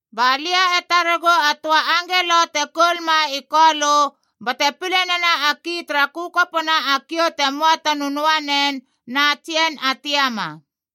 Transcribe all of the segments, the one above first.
Ba lia e taregu a töa angelo te koul ma i Kolö bate pile nena a ki tara kökopona a kiou te möa ta nönöanen na a tsien a tiama.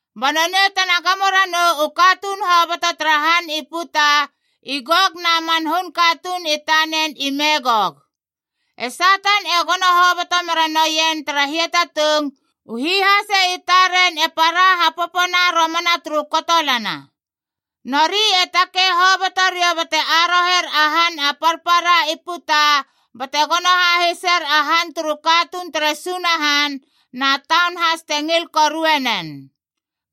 Ba nonei tena gamo ranou u katuun hoboto tara han i puta, i Gok na man hun katuun i tanen i Megok.a E Satan e gono hoboto mera noien tara hiatatung, u hihase i taren e para hapopona romana turu kotolana. Nori e takei hoboto riou bate aroher a han a parpara i putab bate gono hahiser a han turu katuun tere Sunahan na taun has te ngil korue nen.c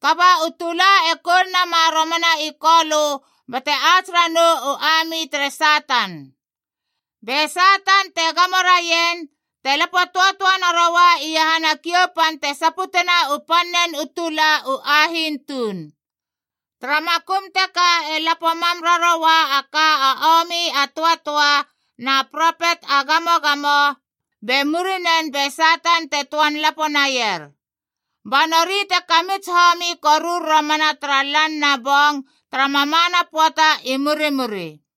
Kaba u tula e koul nama romana i Kolö bate ats ranou u ami tere Satan. Be Satan, te gamo raien, te lapo töatöa naroua iahana kiou pan te saputena u pannen tula u ahiin tuun. Tara makum teka e lapo mam raroua a ka a omi a töatöa na propet a gamogamo, be muriren be Satan te töan lapo naier. Ba nori te kamits homi korur romana tara lan na bong tara mamana pöata i murimuri.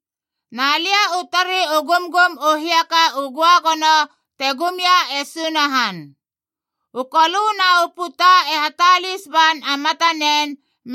Na lia u tari u gumgum u hiaka u göagono te gum ia e Sunahan. U kolöd na u puta e hatalis ban a matanen,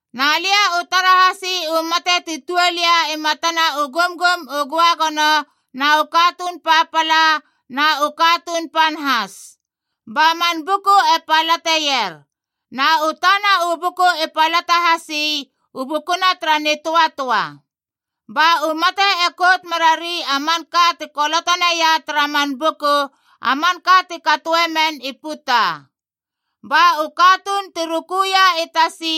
Na lia u tara hasi u mate ti tuol ia i matana u gumgum u göagono, na u katuun papala na u katuun pan has. Ba man buku e palateier. Na u tana u buku i palata hasi, u bukuna tara nitöatöa. Ba u mate e kout merari a manka ti koloto naia tara man buku, a manka ti katoe men i puta. Ba u katuun ti rukuia i tasi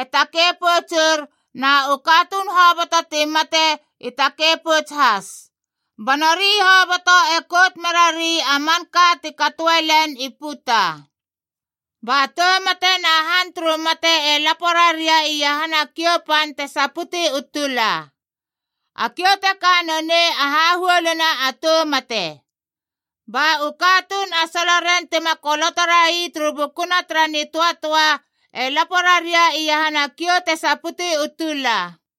e takei poutsur, na u katuun hoboto ti mate i takei pouts has. Ba nori hoboto e kout merari a manka ti katoe len i puta. Ba Tou Mate na Han turu Mate e lapo raria iahana a kiou pan te saputi u tula. A kiou teka nonei a hahuoluna a tou mate. Ba u katuun a soloren tima koloto rai turu bukuna tara nitöatöa e lapo raria iahana kiou te saputi u tula.